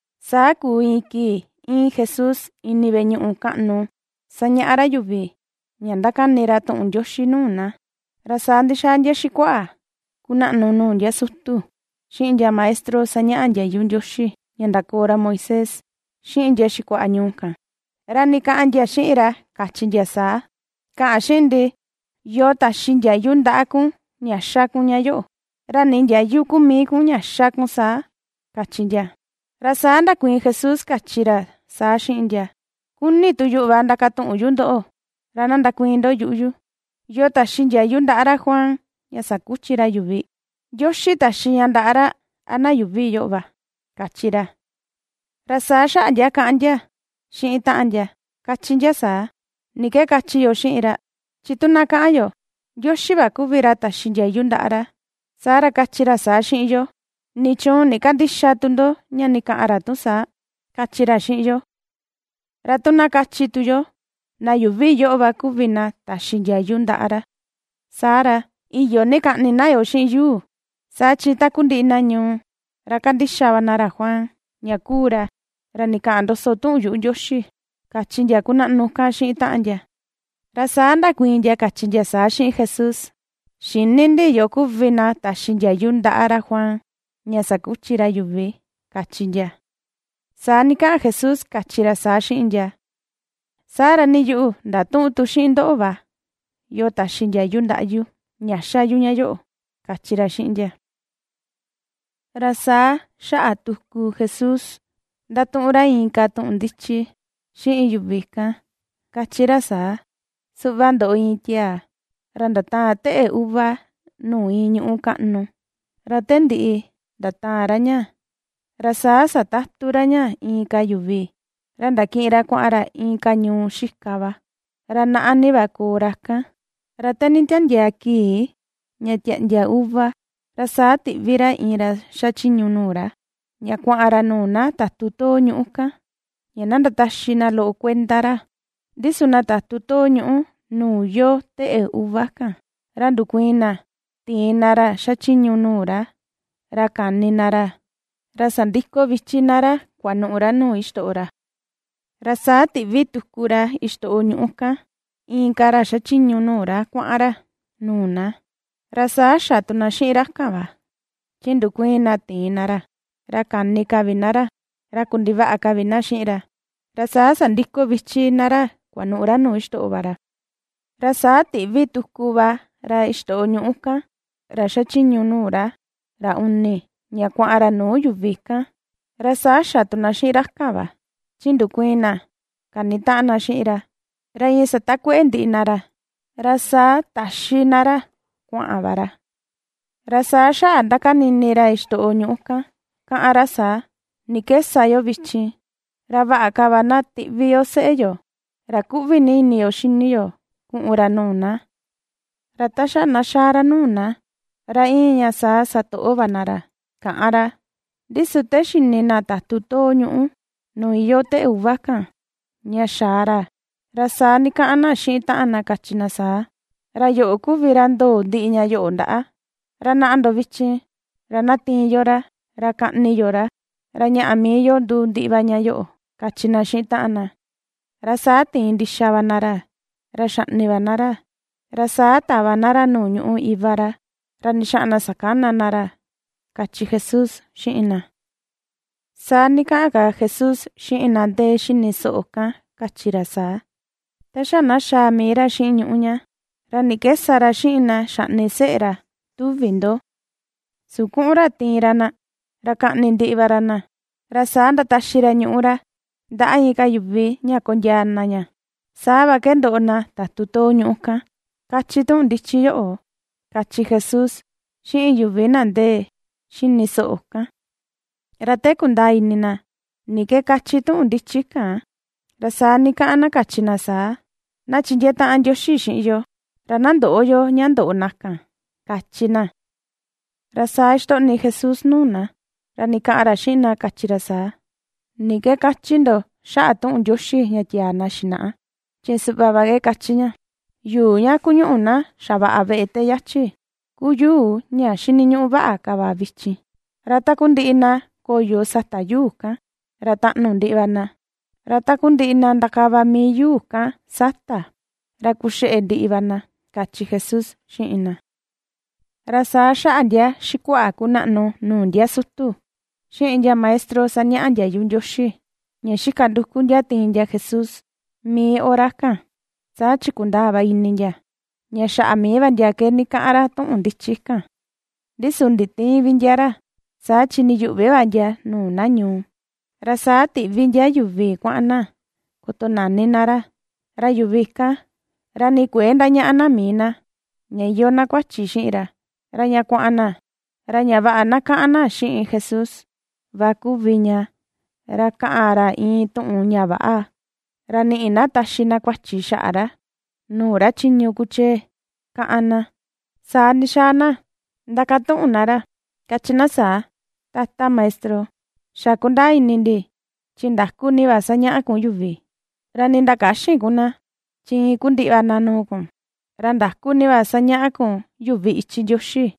Saa kuu iin kii íin Jesús ini veꞌe ñuꞌu kaꞌnu sañaꞌa ra yuvi ña ndakani ra tuꞌun Ndioxi nuu na. Ra saa ndixaa ndia xikuaꞌa kunaꞌnu nuu ndia sutu, xiꞌin ndia maestro sañaꞌa ndiayu Ndioxi ña ndakoo ra Moisés, xiꞌin ndia xikuaꞌa ñuu kan, ra ndikaꞌan ndia xiꞌin ra, kachi ndia saa: ―Kaꞌan xiꞌin ndi, ¿yoo taxi ndiayu ndaꞌa kun ña ^xa kun ña yoꞌo, ra nii ndiayu ku mii kun ña xa kun saa? ―kachi ndia. Ra saa ndakuiin Jesús, kachi ra saa xiꞌin ndia: ―Kuni tu yuꞌu va ndakatuꞌun yu ndoꞌo, ra na ndakuiin ndo yuꞌu yu. ¿Yoo taxi ndiayu ndaꞌa ra Juan ña sakuchi ra yuvi? ¿Ndioxi taxi ña ndaꞌa ra, a na yuuvi yoꞌo va? ―kachi ra. Ra saa xaꞌa ndia kaꞌan ndia xiꞌin taꞌan ndia, kachi ndia saa: ―¿Ni ke kachi yo xiꞌin ra? Chi tu na kaꞌan yo: “Ndioxi va kuvi ra taxi ndiayu ndaꞌa ra”, saa ra kachi ra saa xiꞌin yo: “¿Nichuun ndikandïxa tu ndo ña ndikaꞌan ra tu saa”?, kachi ra xiꞌin yo. Ra tu na kachi tu yo: “Na yuuvi yoꞌo va kuvi na taxi ndiayu ndaꞌa ra”, saa ra, iyo ni kaꞌni na yoo xiꞌin yuu. Saa chi takundiꞌi na ñuu, ra kandixa va na ra Juan ña kuu ra, ra ndikaꞌan ndoso tuꞌun yuꞌu Ndioxi ―kachi ndia kunaꞌnu kan xiꞌin taꞌan ndia. Ra saa ndakuiin ndia, kachi ndia saa xiꞌin Jesús: ―Xïni ndi yoo kuvi na taxi ndiayu ndaꞌa ra Juan ña sakuchi ra yuvi ―kachi ndia. Saa ndikaꞌan Jesús, kachi ra saa xiꞌin ndia: ―Saa ra nii yuꞌu ndatüꞌun tu xiꞌin ndoꞌo va, yoo taxi ndiayu ndaꞌa yu ña xa yu ña yoꞌo ―kachi ra xiꞌin ndia. Ra saa xaꞌa tuku Jesús ^ndatuꞌun ra inka tuꞌun ndichi xiꞌin yuvi kan, kachi ra saa: ―Suꞌva ndoꞌo iin tiaa, ra ndataan teꞌe uva nuu iin ñuꞌu kaꞌnu, ra te ndiꞌi ndataan ra ña, ra saa satatu ra ña inka yuvi, ra ndakiꞌin ra kuaꞌan ra inka ñuu xika va, ra naꞌa ni va koo ra kan. Ra te nditandiaa kii ña tiaꞌndia uva, ra saa tiꞌvi ra iin ra xachiñu nuu ra, ña kuaꞌan ra nuu na tatu too ñuꞌu kan ña na ndataxi na loꞌo kuenda ra. Ndi su na tatu ñuꞌu nuu iyoo teꞌe uva kan, ra ndukuiin na tiin na ra xachiñu nuu ra, ra kani na ra, ra sandiko vichi na ra kuanuꞌu ra nuu xitoꞌo ra. Ra saa tiꞌvi tuku ra xitoꞌo ñuꞌu kan inka ra xachiñu nuu ra kuaꞌan ra nuu na, ra saa xa tu na xiꞌin ra kan va, chi ndukuiin na tiin na ra, ra kani ka vi na ra, ra kundivaꞌa ka vi na xiꞌin ra, ra saa sandiko vichi na ra kuanuꞌu ra nuu xitoꞌo va ra. Ra saa tiꞌvi tuku va ra xitoꞌo ñuꞌu kan, ra xachiñu nuu ra, ra uni, ña kuaꞌan ra nuu yuvi kan, ra sa xa tu na xiꞌin ra kan va, chi ndukuiin na kanitaꞌan na xiꞌin ra, ra iin satakueꞌe ndiꞌi na ra, ra saa taxi na ra kuaꞌan va ra. ’Ra saa xaꞌa ndakani ini ra xitoꞌo ñuꞌu kan, kaꞌan ra saa: “¿Ni ke sa yo vichin? Ra vaꞌa ka va na tiꞌvi yo seꞌe yo, ra kuꞌvi ni ini yo xini yo, kuꞌun ra nuu na. Ra ta xa na xaa ra nuu na, ra iin ña saa satoꞌo va na ra”, kaꞌan ra. Ndi su te xini na tatu too ñuꞌu nuu yoo teꞌe uva kan, ña ^xaa ra, ra saa ndikaꞌan na xiꞌin taꞌan na kachi na saa: “Ra yoꞌo kuvi ra ndoo ndiꞌi ña yoꞌo ndaꞌa. Ra naꞌa ndo vichin, ra na tiin yo ra, ra kaꞌni yo ra, ra ñaꞌa mii yo nduu ndiꞌi va ña yoꞌo”, kachi na xiꞌin taꞌan na. Ra saa tiin ndixa va na ra, ra xaꞌni va na ra, ra saa tava na ra nuu ñuꞌu iva ra, ra ndixaꞌan na sakana na ra ―kachi Jesús xiꞌin na. Saa ndikaꞌan ka Jesús xiꞌin na ndee xini soꞌo kan, kachi ra saa: ―Ta xa na xaa mii ra xiꞌin ñuꞌu ña, ¿ra ni ke sa ra xiꞌin na xaꞌni seꞌe ra, tuvi ndo? Su kuꞌun ra tiin ra na, ra kaꞌni ndiꞌi va ra na, ra saa ndataxi ra ñuꞌu ra ndaꞌa inka yuvi ña kondiaa na ña. Saa va ke ndoꞌo na tatu too ñuꞌu kan, kachi tuꞌun ndichi yoꞌo ―kachi Jesús xiꞌin yuvi na ndee xini soꞌo kan. Ra te kundaa ini na ni ke kachi tuꞌun ndichi kan, ra saa ndikaꞌan na, kachi na saa: ―¡Na chindiee taꞌan ndioxi xiꞌin yo ra na ndöꞌo yo ña ndoꞌo na kan! ―kachi na. Ra saa xitoꞌni Jesús nuu na, ra ndikaꞌan ra xiꞌin na, kachi ra saa: ―¿Ni ke kachi ndo xaꞌa tuꞌun Ndioxi ña tiaa na xinaꞌa? Chi suꞌva va ke kachi ña: Yuu ña kuñuꞌu na xavaꞌa veꞌe ta yachi ku yuu ña xiniñuꞌu vaꞌa ka va vichin. Ra takundiꞌi na koyo sata yuu kan, ra taꞌnu ndiꞌi va na, ra takundiꞌi na ndakava mii yuu kan sata, ra kuxeꞌe ndiꞌi va na ―kachi Jesús xiꞌin na. Ra saa xaꞌa ndia xikuaꞌa kunaꞌnu nuu ndia sutu, xiꞌin ndia maestro sañaꞌa ndiayu Ndioxi, ña xika nduku ndia tiin ndia Jesús, mii hora kan, saa chi kundaa va ini ndia, ña xaꞌa mii va ndia ke ndikaꞌan ra tuꞌun ndichi kan; ndi su nditïin vi ndia ra, saa chi ndiyuꞌvi va ndia nuu na ñuu. Ra saa tiꞌvi ndia yuvi kuaꞌan na kotonani na ra, ra yuvi kan ra nii kuëe ndañaꞌa na mii na ña iyoo na kuachi xiꞌin ra, ra ña kuaꞌan na ra ña vaꞌa na kaꞌan na xiꞌin Jesús va kuvi ña ra kaꞌan ra iin tuꞌun ña väꞌa ra niꞌi na taxi na kuachi xaꞌa ra nuu ra chiñu kuchee, kaꞌan na. Saa ndixaa na ndakatuꞌun na ra, kachi na saa: ―Tata Maestro, xa kundaa ini ndi chi ndaku ni va sañaꞌa kun yuvi, ra nii ndakäxin ku na, chi iin ku ndiꞌi va na nuu kun, ra ndaku ni va sañaꞌa kun yuvi ichi Ndioxi.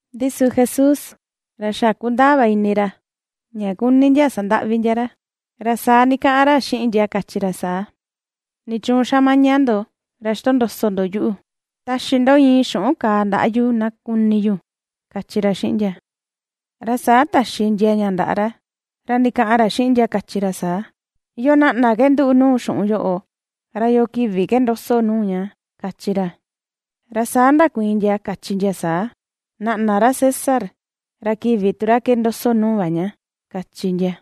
Ndi su Jesús ra xa kundaa va ini ra ña kuni ndia sandaꞌvi ndia ra, ra saa ndikaꞌan ra xiꞌin ndia kachi ra saa: ―¿Nichuun xa maña ndo ra xitondoso ndo yuꞌu? Taxi ndo iin xuꞌun kaa ndaꞌa yu na kuni yu ―kachi ra xiꞌin ndia. Ra saa taxi ndia ña ndaꞌa ra, ra ndikaꞌan ra xiꞌin ndia, kachi ra saa: ―¿Yoo naꞌna ke nduꞌu nuu xuꞌun yoꞌo, ra yoo kivi ke ndoso nuu ña? ―kachi ra. Ra saa ndakuiin ndia, kachi ndia saa: ―Naꞌna ra César, ra kivi tu ra ke ndoso nuu va ña ―kachi ndia.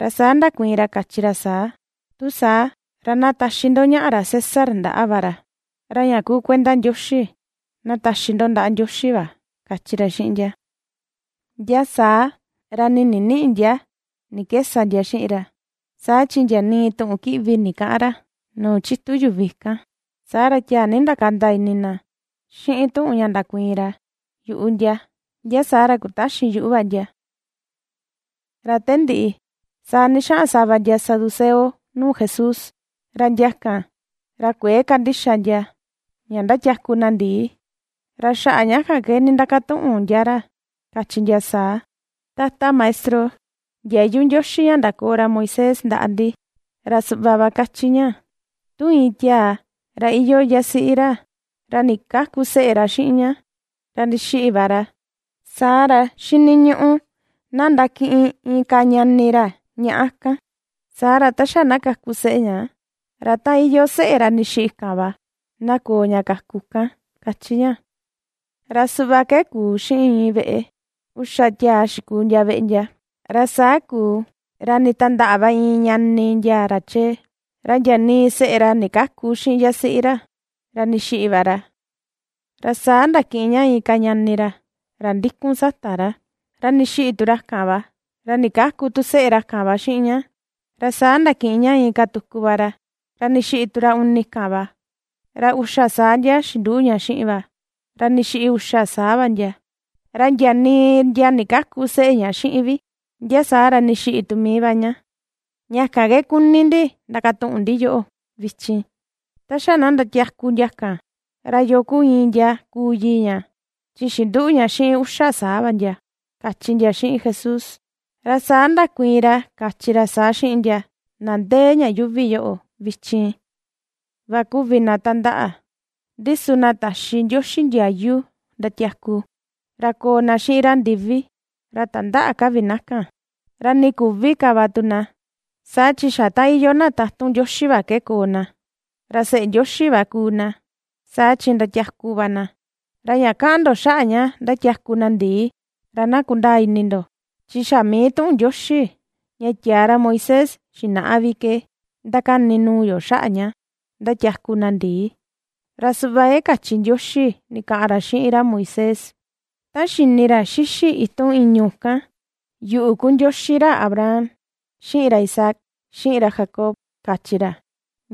Ra saa ndakuiin ra, kachi ra saa: ―Tu saa, ra na taxi ndo ñaꞌa ra César ndaꞌa va ra, ra ña kuu kuenda Ndioxi, na taxi ndo ndaꞌa Ndioxi va ―kachi ra xiꞌin ndia. Ndia saa ra nii ndiniꞌi ndia ni ke sa ndia xiꞌin ra, saa chi ndia nii tuꞌun kiꞌvi ndikäꞌan ra nuu chitu yuvi kan, saa ra tiaa ni ndakanda ini na xiꞌin tuꞌun ña ndakuiin ra yuꞌu ndia, ndia saa ra kutaxin yuꞌu va ndia. Ra te ndiꞌi, saa ndixaꞌan sava ndia saduceo nuu Jesús. Ra ndia kan, ra kuëe kandixa ndia ña ndatiaku na ndii, ra xaꞌa ña kan ndindakatuꞌun ndia ra kachi ndia saa: ―Tata Maestro, ndiayu Ndioxi ña ndakoo ra Moisés ndaꞌa ndi ra suꞌva va kachi ña: “Tu iin tiaa ra iyoo yasiꞌi ra, ra ndikäku seꞌe ra xiꞌin ña, ra ndixiꞌi va ra, saa ra xiniñuꞌu na ndakiꞌin inka ñani ra ñaꞌa kan, saa ra, ta xa na kaku seꞌe ña, ra ta iyoo seꞌe ra ndixiꞌi kan va, na koo ña kaku kan”, kachi ña. Ra suꞌva ke kuu xiꞌin iin veꞌe, uxa tiaa xikuu ndia veꞌe ndia. Ra saa kuu ra nditandaꞌa va iin ñani ndia ra chee, ra ndia nii seꞌe ra ndikäku xiꞌin yasiꞌi ra, ra ndixiꞌi va ra. Ra saa ndakiꞌin ña inka ñani ra, ra ndikun sata ra, ra ndixiꞌi tu ra kan va, ra ndikäku tu seꞌe ra kan va xiꞌin ña. Ra saa ndakiꞌin ña inka tuku va ra, ra ndixiꞌi tu ra uni kan va, ra uxa saa ndia xinduꞌu ña xiꞌin va, ra ndixiꞌi uxa saa va ndia; ra ndia nii ndia ndikäku seꞌe ña xiꞌin vi. Ndia saa ra ndixiꞌi tu mii va ña. Ña kan ke kuni ndi ndakatuꞌun ndi yoꞌo vichin, ta xa na ndatiaku ndia kan, ¿ra yoo kuu iin ndia kuu yii ña, chi xinduꞌu ña xiꞌin uxa saa va ndia? ―kachi ndia xiꞌin Jesús. Ra saa ndakuiin ra, kachi ra saa xiꞌin ndia: ―Na ndee ña yuuvi yoꞌo vichin va kuvi na tandaꞌa. Ndi su na taxi Ndioxi ndiayu ndatiaku, ra koo na xiꞌin ra ndivi, ra tandäꞌa ka vi na kan. Ra nii küvi ka va tu na. Saa chi xa ta iyoo na tatun Ndioxi va ke koo na, ra seꞌe Ndioxi va kuu na saa chi ndiatiaku va na. Ra ña kaꞌan ndo xaꞌa ña ndatiaku na ndii, ra na kundaa ini ndo, chi xa mii tuꞌun Ndioxi ña tiaa ra Moisés xinaꞌa vi ke ndakani nuu yo xaꞌa ña ndatiaku na ndii. Ra suꞌva ke kachi Ndioxi ndikaꞌan ra xiꞌin ra Moisés ta xini ra xixi itun ìñu̱ kan: “Yuꞌu kuu Ndioxi ra Abraham, xiꞌin ra Isaac, xiꞌin ra Jacob”, kachi ra.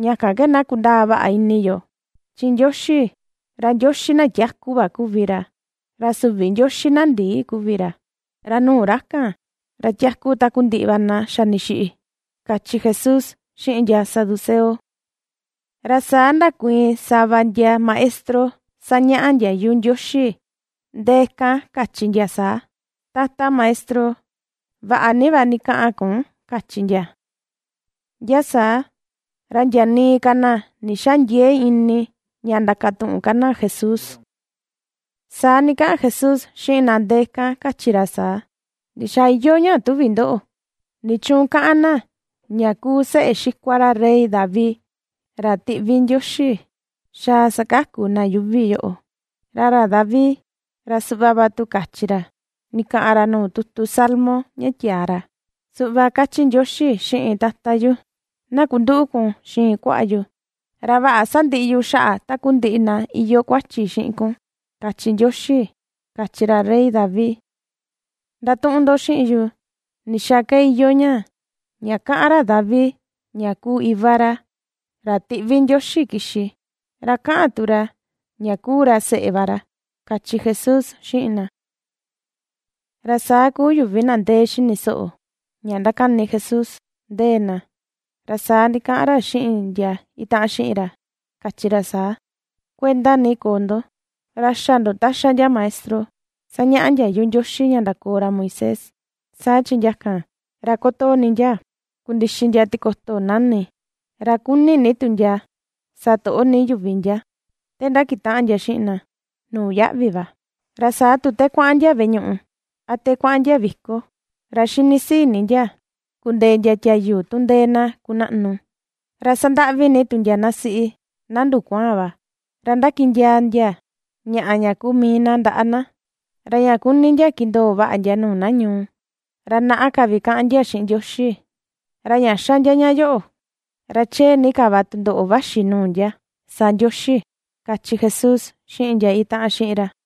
Ña kan ke na kundaa vaꞌa ini yo. Chi Ndioxi, ra Ndioxi na tiaku va kuvi ra. Ra süvi Ndioxi na ndii kuvi ra, ra nuu ra kan ra tiaku takundiꞌi va na xa ndixiꞌi ―kachi Jesús xiꞌin ndia saduceo. Ra saa ndakuiin sava ndia maestro sañaꞌa ndiayu Ndioxi ndee kan, kachi ndia saa: ―Tata Maestro, vaꞌa ni va ndikaꞌan kun ―kachi ndia. Ndia saa, ra ndia nii ka na ndixäa ndiee ini ña ndakatuꞌun ka na Jesús. Saa ndikaꞌan Jesús xiꞌin na ndee kan, kachi ra saa: ―¿Ndixaa iyoo ña tuvi ndoꞌo? ¿Nichuun kaꞌan na ña kuu seꞌe xikua ra rey David ra tiꞌvi Ndioxi xaa sakaku na yuuvi yoꞌo? Ra ra David, ra suꞌva va tu kachi ra ndikaꞌan ra nuu tutu Salmo ña tiaa ra: Suꞌva kachi Ndioxi xiꞌin Tata yu: “Na kunduꞌu kun xiin kuaꞌa yu ra vaꞌa sandiꞌi yu xaꞌa takundiꞌi na iyoo kuachi xiꞌin kun”, kachi Ndioxi, kachi ra rey David. Ndatuꞌun ndo xiꞌin yu, ¿ndixaa ke iyoo ña, ña kaꞌan ra David ña kuu iva ra, ra tiꞌvi Ndioxi kixi, ra kaꞌan tu ra ña kuu ra seꞌe va ra? ―kachi Jesús xiꞌin na. Ra saa kuu yuvi na ndee xini soꞌo ña ndakani Jesús ndee na, ra saa ndikaꞌan ra xiꞌin ndia itaꞌan xiꞌin ra, kachi ra saa: ―Kuenda ni koo ndo, ra xä ndo ta xa ndia maestro sañaꞌa ndiayu Ndioxi ña ndakoo ra Moisés, saa chi ndia kan, ra kotoo ni ndia kundixi ndia tikoto nani, ra kuni ni tu ndia satoꞌo ni yuvi ndia te ndakutaꞌan ndia xiꞌin na nuu yaꞌvi va. Ra saa tu te kuaꞌan ndia veꞌe ñuꞌu a te kuaꞌan ndia viko, ra xini sii ni ndia kundee ndia tiayu tu ndee na kunaꞌnu. Ra sandaꞌvi ni tu ndia na siꞌi na ndukuaan va, ra ndakiꞌin ndiaa ndia ñaꞌa ña kuu mii na ndaꞌa na. Ra ña kuni ndia kindoo vaꞌa ndia nuu na ñuu, ra naꞌa ka vi kaꞌan ndia xiꞌin Ndioxi. Ra ña xa ndia ña yoꞌo, ra chee ni ka va tundoꞌo vaxi nuu ndia sa Ndioxi ―kachi Jesús xiꞌin ndia itaꞌan xiꞌin ra.